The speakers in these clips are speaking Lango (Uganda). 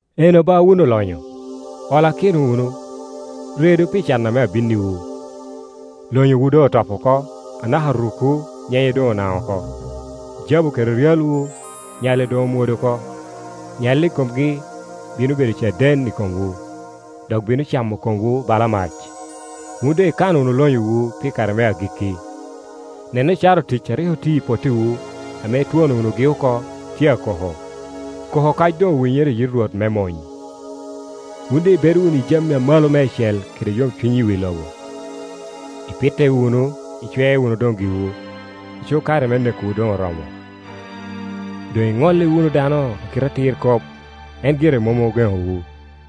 Eno ba wun olonyo, ollakino wunu, redu, pi can ame abinniwu. Lonyowu doŋ otop oko, anaka rukwu nyenye doŋ onaŋo oko. Jabu kede ryalwu, nyalli doŋ omwodo oko; nyalli i komgi bino bedo caden i komwu, dok bino camo komwu bala mac. Wun doŋ ikano wunu lonyowu pi kare me agikki. Nen ocara otic a rik otio i pottiwu ame itwono wunugi oko, tye akoko, koko okac doŋ owinyere i yit Rwot me mony. Wun doŋ ibedo wunu i jami amalo meicel kede yomcuny i wi loba; ipitte wunu, icwe wunu doŋ giwu, aco kare me nekowu doŋ oromo! Doŋ iŋolli wunu dano a kite atir kop, en gire mom ogeŋowu.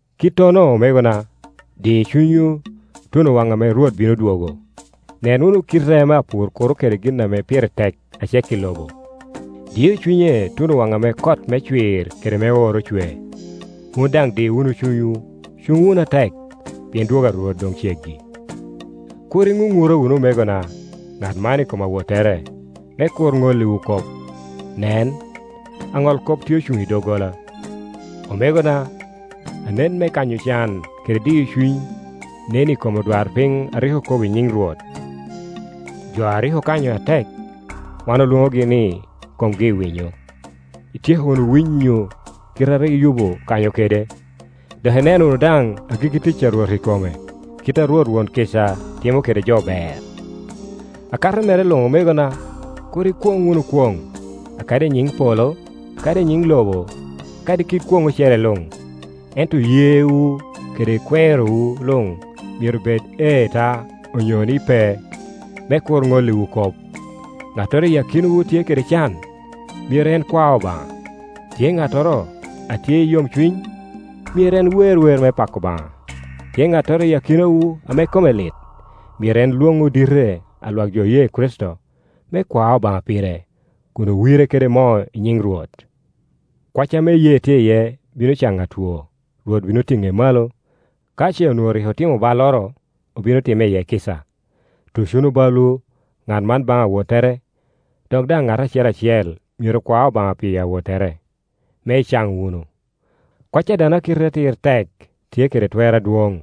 Kittono omegona, di cunywu tuno waŋ ame Rwot bino dwogo. Nen wunu kite ame apur kuro kede gin ame pire tek a cek i lobo; dio cunye tuno waŋ ame kot me cwir kede me oro ocwe. Wun daŋ di wunu cunywu, cuŋ wunu atek, pien dwogo a Rwot doŋ ceggi. Kur iŋuŋura wunu omegona, ŋat man i kom awottere, me kur ŋolliwu kop. Nen, Aŋolkop tye ocuŋ i doggola. Omegona, anen me kanyo can kede diyo cuny nen i kom odwarpiny a rik okobo i nyiŋ Rwot. Jo a rik okanyo atek, wan olwoŋogi ni komgi i winyo. Ityeko wunu winyo kite a rik Yubu okanyo kede, dok ineno wunu daŋ agikki tic a Rwot i kome, kit a Rwot won kica, timo kede jo ber. Akato mere luŋ omegona, kur ikwoŋ wunu kwoŋ, kadi i nyiŋ polo, kadi i nyiŋ lobo, kadi kit kwoŋ ocele luŋ; ento yewu kede kwerowu luŋ myero bed, “Ee ta”, onyo ni, “Pe”, me kur ŋolliwu kop. Ŋattoro iyi akinawu tye kede can? Myero en kwa Obaŋa. Tye ŋattoro a tye i yomcuny? Myero en wer wer me pako Obaŋa. Tye ŋattoro iyi akinawu ame kome lit? Myero en lwoŋ odite a lwak jo oye Kricito, me kwa Obaŋa pire kun owire kede moo i nyiŋ Rwot. Kwac ame iyee tye iye bino caŋo atwo, Rwot bino tiŋe malo; ka ce onwoŋo rik otimo balloro, obino timme iye kica. Tuc wunu balwu, ŋat man baŋ awottere, dok daŋ ŋat acel acel myero kwa Obaŋa pi awottere, me icaŋ wunu. Kwac a dano a kite atir tek, tye kede twer adwoŋ.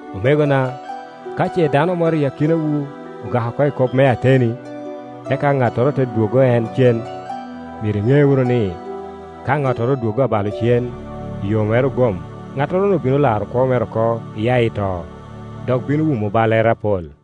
Omegona, ka ce dano moro i akinawu ogak oko i kop me ateni, eka ŋattoro te dwoggo en cen, Pet. 4.8myero iŋe wunu ni, ka ŋattoro odwoggo abalo cen i yo mere ogom, ŋattoro-nu bino laro kwo mere oko iya i to, dok bino wumo ballere apol.